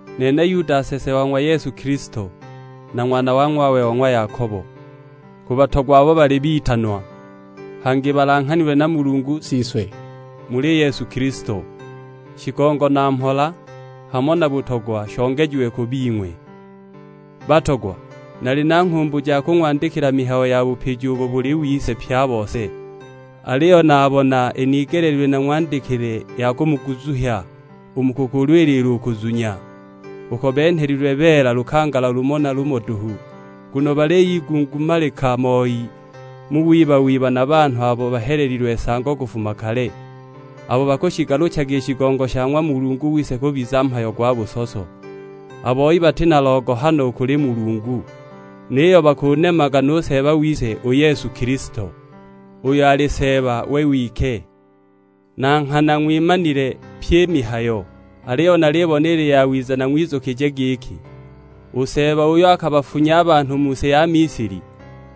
Nene Yuda nsese wa ng'wa Yesu Kilisto, na ng'wana wa ng'wawe wa ng'wa Yakobo. Ku batogwa abo bali bitanwa, hangi balanghanilwe na Mulungu Siswe muli Yesu Kilisto. Shigongo na mhola, hamo na butogwa shongejiwe ku bing'we. Batogwa, naali na nghumbu ja kung'wandikila mihayo ya bupiji ubo buli wise pye a bose. Aliyo nabona inigeleelilwe nang'wandikile ya kumuguzuhya u mu kukulwilila u kuzunya, uko benhelilwe beela lukangala lumo na lumo duhu. Nguno baliyigungumalika moi mu wiba-wiba na banhu abo bahelelilwe nsango kufuma kale, abo bakushigaluchaga i shigongo sha ng'wa Mulungu wise kubiza mhayo gwa busoso. A boi bati na logohano u kuli Mulungu, niyo bakunemaga nu Seeba wise u Yesu Kilisto, uyo ali Seeba we wike. Na nghana ng'wimanile pyi i mihayo, aliyo nalibona ili yawiza nang'wizukije giki, u Seeba uyo akabafunya a banhu mu si ya Misili,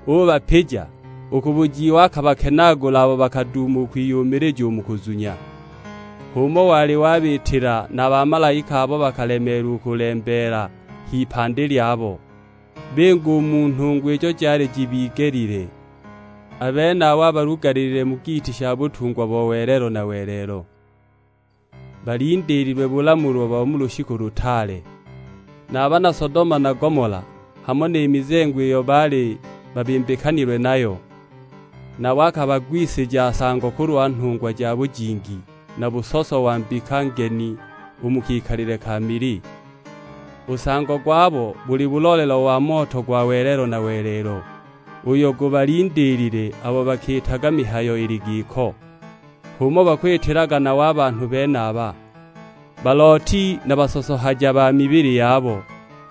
ubapija, u ku bujiiwa akabakenaagula abo bakaduuma u kwiyumilija u mu kuzunya! H'umo wali wabiitila na a bamalaika abo bakalemeelwa kulembeela h'ipandi lyabo, binga u mu nhungwa ijo jaali jibigelile. A benabo abalugalilile mu giiti sha butungwa bo welelo na welelo; balindiililwe bulamulwa bo mu lushiku lutaale. Na a bana Sodoma na Gomola, hamo ni mizengo iyo baali babimbikanilwe nayo, nabo akabagwisija nsango kulwa nhungwa ja bujingi, na busoso wa mbika ngeni u mu kikalile ka mili. U nsango gwabo buli bulolelo wa moto gwa welelo na welelo, uyo gubalindiilile abo bakiitaga mihayo ili giko. H'umo bakwitilaga nabo a banhu benaba, balooti na basosohaja ba mibili yabo,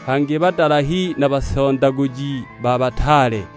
hangi badalahi na basondaguji ba bataale!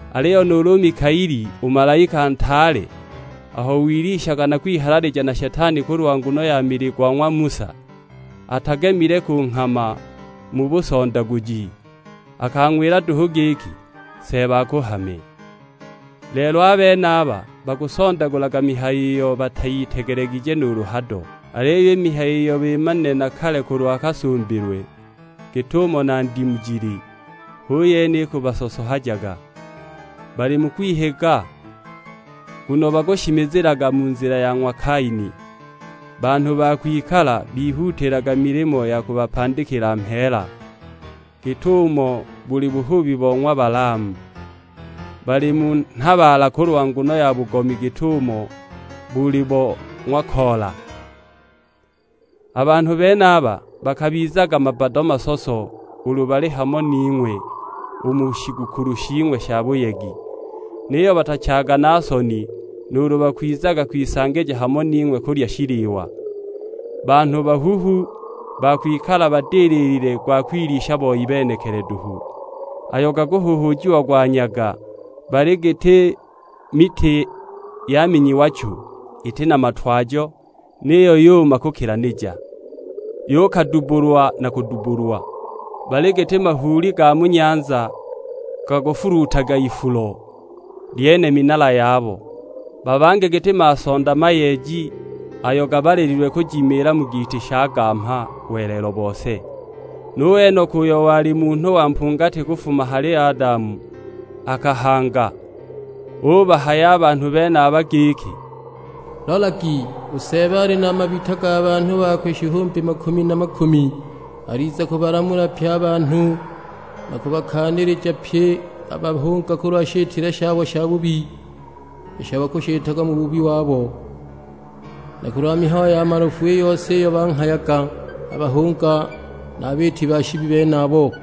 Aliyo nuulu u Mikaeli, u malaika ntaale, aho wilwishaga na kwihalalija na Shetani kulwa nguno ya mili go ng'wa Musa, atagimile kunghama mu busondaguji; akang'wila duhu giki, "Seeba akuhame." Lelo a benaba, bakusondagulaga mihayo iyo batayitegelegije nuulu hado! Aliyo i mihayo iyo bimanile na kale kulwa kasumbilwe, git'umo na ndimu jili, hu yene ikubasosohajaga. Bali mu kwihiga, nguno bakushimizilaga mu nzila ya ng'wa Kaini; banhu ba kwikala bihuutiilaga milimo ya kubapandikila mheela, git'umo boli buhubi bo ng'wa Balaamu. Bali mu nhabaala kulwa nguno ya bugomi git'ubo boli bo ng'wa Kola. A banhu benaba bakabizaga mabbado masoso ulu bali hamo ning'we u mu shigukulu shing'we sha buyegi, niyo batachaaga na soni nuulu bakwizaga kwisangija hamo ning'we kulya shiliwa. Banhu bahuhu ba kwikala badililile gwa kwilisha boi benekili duhu, babange malunde maduhu, ayo gakuhuhuujiagwa nyaga, bali giti miti yaminyiwa chu, iti na matwajo; niyo yuma yukilanija, yukadubbulwa na kudubbulwa! Bali giti mahuuli ga mu nyanza gakufuluutaga ifulo, lyene minala yabo. Babange giti masonda mayeeji ayo gabalililwe kujimilila mu giiti sha gamha welelo bose! Nu Enoka, uyo wali munhu wa mpungati kufuma hali Adamu akahanga, ubahaya a banhu benaba giki, "Lolagi, u Seeba ali na mabita ga banhu bakwe shihumbi makumi na makumi. Aliza kubalamula pye a banhu na kubakaanilija pye a bahunga kulwa shitile shabo shabubi, isho bakushitaga mu bubi wabo; na kulwa mihayo ya malofu i yose iyo banghayaga a bahunga na a biiti ba shibi benabo!"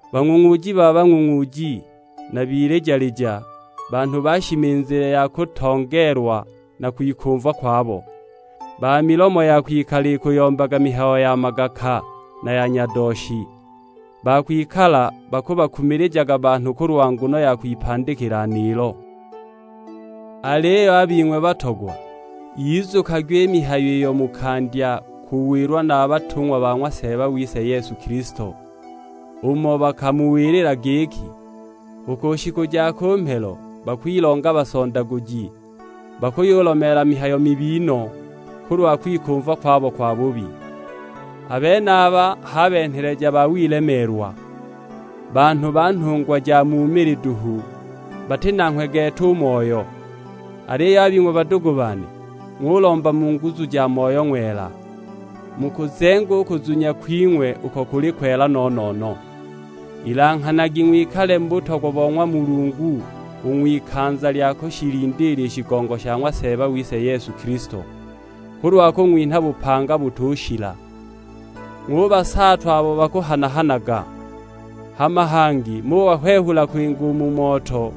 Bang'ung'uuji ba bang'ung'uuji na bilija-lija, banhu ba shimizile ya kutongeelwa na kwikumva kwabo; ba milomo ya kwikala ikuyombaga mihayo ya magaka, na ya nyadooshi, ba kwikala bakubakumilijaga banhu kulwa nguno ya kwipandikila niilo! Aliyo a bing'we batogwa, yizukagwi i mihayo iyo mukandya kuwilwa na a batung'wa ba ng'wa Seeba wise Yesu Kilisto. Umo bakamuwilila giki, "U ku shiku ja ku mhelo bakwilonga basondaguji, bakuyulomeela mihayo mibi no, kulwa kwikumva kwabo kwabubi." A benaba h'a benheleja ba wilemeelwa, banhu ba nhungwa ja mu mili duhu, bati nanghwe gete u Moyo! Aliyo a bing'we badugu bane, ng'ulomba mu nguzu ja ng'wa Moyo Ng'wela, mukuzenge u kuzunya kwing'we uko kuli kwela no-no-no. Ilanghanagi, ng'wikale mu butogwa bo ng'wa Mulungu u ng'wikanza lya kushilindiila i shigongo sha ng'wa Seeba wise Yesu Kilisto, kulwa kung'winha bupanga butushila. Ng'ubasaatwa abo bakuhana-hanaga. Hama bangi ng'ubahwehula kwinga u mu moto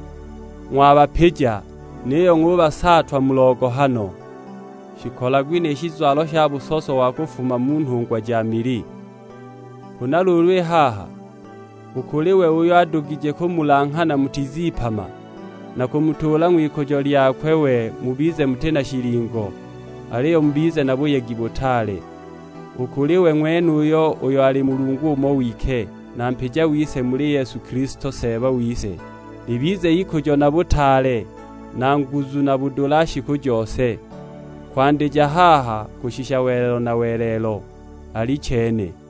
ng'wabapija; niyo ng'ubasaatwa mu logohano. Shikolagwi ni shizwalo sha busoso wa kufuma mu nhungwa ja mili. Huna luulu i haha, u kuli we uyo adugije kumulanghana mutizipama, na kumutuula ng'wikujo lyakwe we mubize muti na shilingo, aliyo mubize na buyegi butaale; u kuli we ng'wenuyo uyo ali Mulungu umo wike, na mpija wise muli Yesu Kilisto Seeba wise, libize ikujo na butaale, na nguzu na budula shiku jose; kwandija haha kushisha welelo na welelo: Alichene.